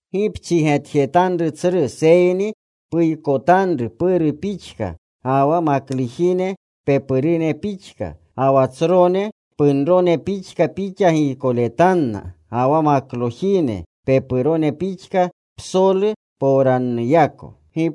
Gi pchigetjetanru tsru, seyni puykotanru puru pixka, ga wa maklujine pepurune pixka. Ga wa tsrone punrone pixka pixa giykoletanna, ga wa maklojine pepurone pixka psolu powranuyako.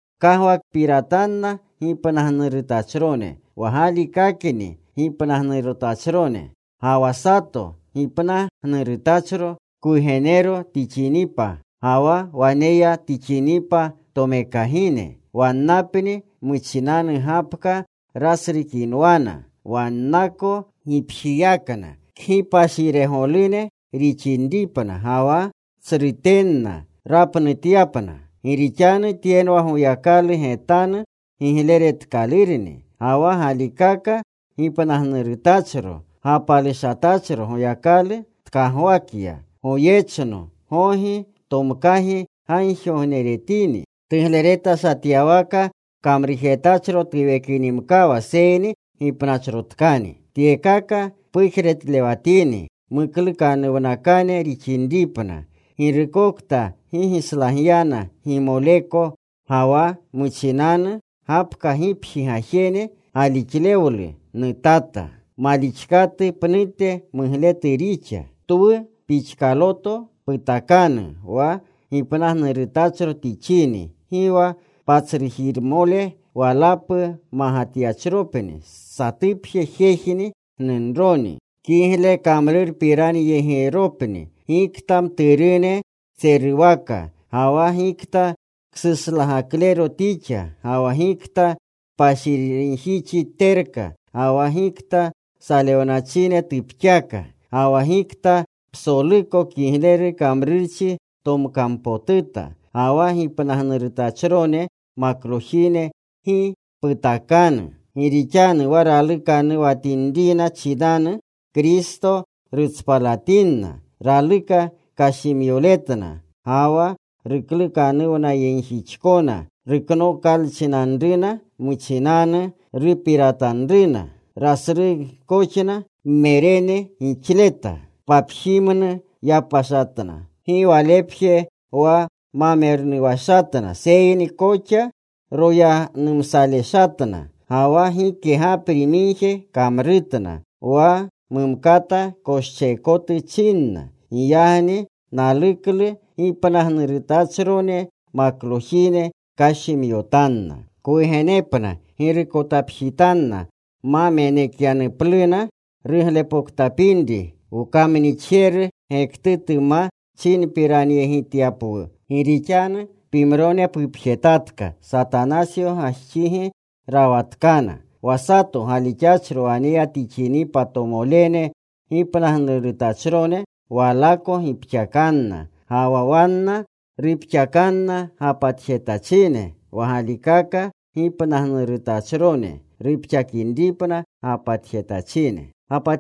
Pkagwakpiratanna gipnagnurutachrone wa galikakakni gipnagnurutachrone. Ga wa sato gipnagnurutachro kwugenero tixinripa, ga wa waneya tixinipa tomekagine wannapni muchinanu gapka rasrukinwana wannako gipjiyakna kgipashiregolune rixinripna, ga wa tsrutenna rapnutyapna. Gi rixanu tyenwa Goyakalu getanu gigleretkalurni. Ga wa galikaka gipnagnurutachro gapalushatachro Goyakalu tkagwakya. Goyechno, gogi tomkagi gagjigogneretini. Tugleretashatyawaka kamrujetachro tuwekinimkawa seyni gipnachrotkani. Tyekaka pujretlewatini, muklukanuwnakane rixinripna. Girukokta gi gislagyana gimoleneko, ga wa muchinanu gapka gipji gajene, galixlewlu nutata. Malixkatu pnute mugletu rixa. Twu pixkaloto putakanu wa gipnagnurutachro tixini: gi wa patsrujiremole walapu magatyachropni, satupje jejni gnunroni. Kiglekamrurpiranyegiropni, gikta mturune tseruwaka, ga wa gikta ksuslagaklero tixa, ga wa gikta kpashirinjixi terka, ga wa gikta salewnachine tupxaka, ga wa gikta psoluko kigleru kamrurchi tomkampotuta. Ga wa gipnagnurotachrone maklojine gi putakanu. Gi rixanu wa ralukanuwatinrina chinanu Kristo rutspalatinna, raluka kashimyoletna. Ga wa ruklukanuwnayegjixkona ruknokalchinanruna muchinanu rupiratanruna. Rasrugkoxna mmerene gixleta. Papjimnu yapashatna. Gi walepje wa ma mernuwashatna, seyni koxa royanumsaleshatna ga wa gike gapri migje kamrutna. Wa mumkata koscheekotu chinna. Giyagni naluklu gipnagnurutachrone maklojine kashimyotanna, kwugenepna, girukotapjitanna, ma menekyanupluna ruglepoktapinri wkamnixjeru gektutu ma chinpiranyegityapwu. Gi rixanu pimrone pupjetatka. Satanasyo gajxigi rawanatkana. Wa sato galixachro waneya tixinipa tomolene gipnagnurutachrone walako gipxakanna. Gi wa wanna rupxakanna gapatjetachine, wa galikaka gipnagnurutachrone rupxakinripna gapatjetachine.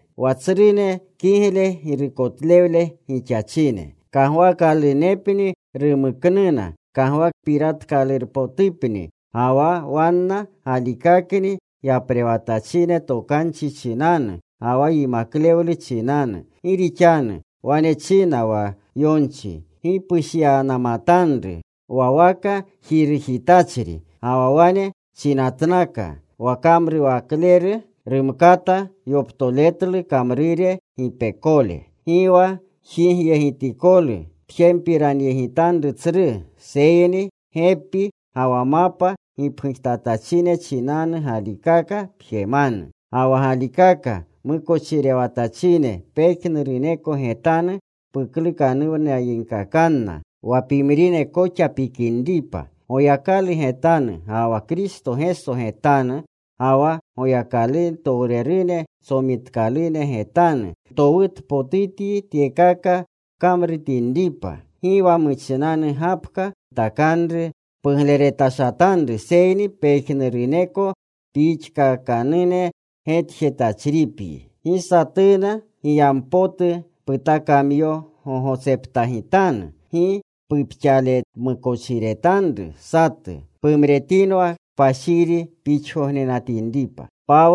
Wa tsrune kigle girukotlewle gixachine, kagwaakalunepni rumuknuna kagwakpiratkalunpotupni, ga wa wanna galikakni yaprewatachine tokanchi chinanu ga wa yimaklewlu chinanu. Gi rixanu wane china wa yonchi: Gi pushyanamatanru wa waka wa jirujitachri. Ga wa wane chinatnaka, “Wa kamrurewakleru rumkata yoptoletlu kamrure gipekole.” Gi wa jigyegitikolu pjempiranyegitanru tsru, seyni gepi ga wa mapa gipgujtatachine chinanu galikaka pjemanu. Ga wa galikaka mukochirewatachine, pejnuruneko getanu puklukanuwnayegkakanna, wa pimrine koxa pikinripa. Goyakalu getanu, ga wa Kristo Geso getanu, ga wa Goyakalutowrerune tsomitkalune getanu, ntowutpotutyi tyekaka pkamritinripa; gi wa muchinanu gapka putakanru pugleretashatanru seyni pejnuruneko pixkakakane getjetachripyi. Gi satuna giyampotu putakamyogogotseptagitanu. Gi pupxaletmukochiretanru satu. Pumretinwa kpashiri pixgognenatinripa.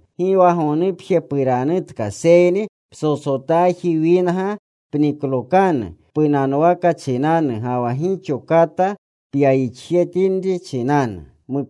Gi wa gonupje puranutka, seyni ptsotsotaji winga pniklokanu punanwaka chinanu, ga wa gixo kata pyayixjetinri chinanu.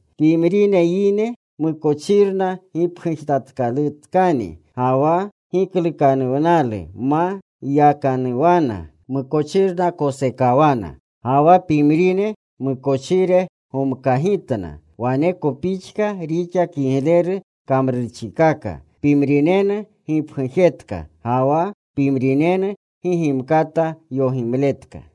Pimrine yine mukochirna gipgujetkalurutkani. Ga wa giklukanuwnalu ma yakanuwana; mukochirna kosekawana. Ga wa pimrine mukochire gomkagitna. Waneko pixka rixa kigleru kamrurchikaka. Pimrinenu gipgujetka. Ga wa pimrinenu gi gimkata yogimletka.